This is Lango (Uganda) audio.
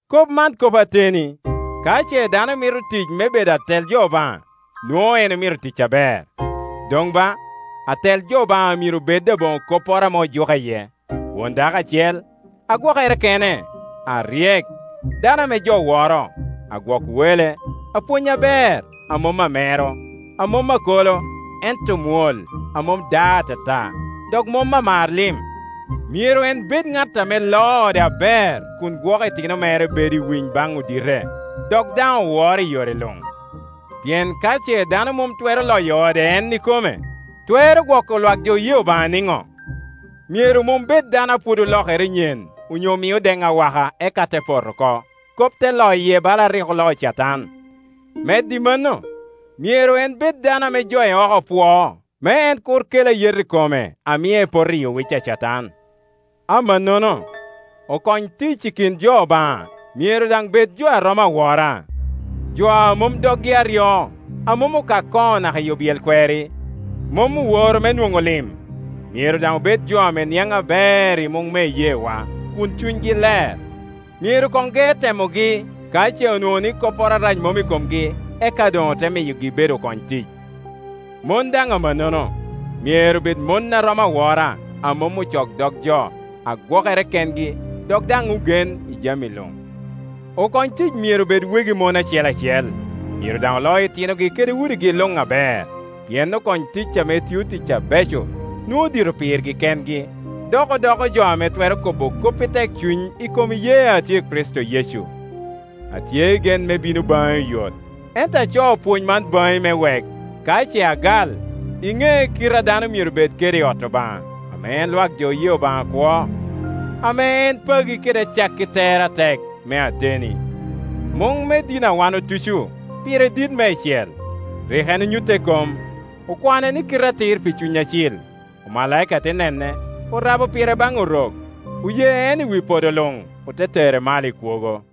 Kop man kop ateni: ka ce dano mito tic me bedo atel jo Obaŋa, nwoŋo en omito tic aber. Doŋ ba, atel jo Obaŋa myero bed aboŋo kopporo ame ojuke iye, won dako acel, a gwokere kene, a ryek, dano ame jo woro, agwok wele, apwony aber, a mom amero, a mom akolo, ento mwol, a mom ada atata, dok mom amar lim. Myero en bed ŋat ame loo ode aber kun gwoko itino mere bedo i winy baŋ odite, dok daŋ oworo i yore luŋ; pien ka ce dano mom twero loyo ode en ikome, twero gwoko lwak jo oye Obaŋa niŋo? Myero mom bed dano a pwod olokere nyen onyo mio den awaka, eka te poto oko, kop te loye bala a rik oloo Catan. Medo i mano, myero en bed dano ame jo i oko pwoo, me en kur kel ayet i kome a mie poto i owic a Catan. Amannono, okony tic i kin jo Obaŋa, myero daŋ bed jo a romo awora, jo a mom doggi aryo, a mom okak koŋo naka i obyel kweri, mom oworo me nwoŋo lim, myero daŋ obed jo ame niaŋ aber i muŋ me iyeewa, kun cunygi ler. Myero koŋ ge temogi; ka ce onwoŋo ni kopporo arac mom i komgi, eka doŋ ote miyogi bedo okony tic. Mon daŋ amannono, myero bed mon a romo awora, a mom ocok dog jo, a gwokere kengi dok daŋ ogen i jami luŋ. Okony tic myero bed wegi mon acel acel, myero daŋ oloo itinogi kede udigi luŋ aber; pien okony tic ame tio tic abeco nwoŋo dito pirgi kengi, dok odoko jo ame twero kobo kop i tek cuny i kom iyee a tye i Kricito Yecu. Atye i gen me bino baŋi oyot, ento acoo pwony man baŋi me wek, ka ce agal, iŋe kite a dano myero bed kede i ot Obaŋa, ame en lwak jo oye Obaŋa akwo, ame en pagi kede acakki tere atek, me ateni. Muŋ me dini a wan otuco, pire dit meicel; Rik en onyutte i kom, okwane ni kite atir pi Cuny Acil, omalaika te nene, orabo pire baŋ Orok, oye en i wi podo luŋ; ote tere malo i kwogo.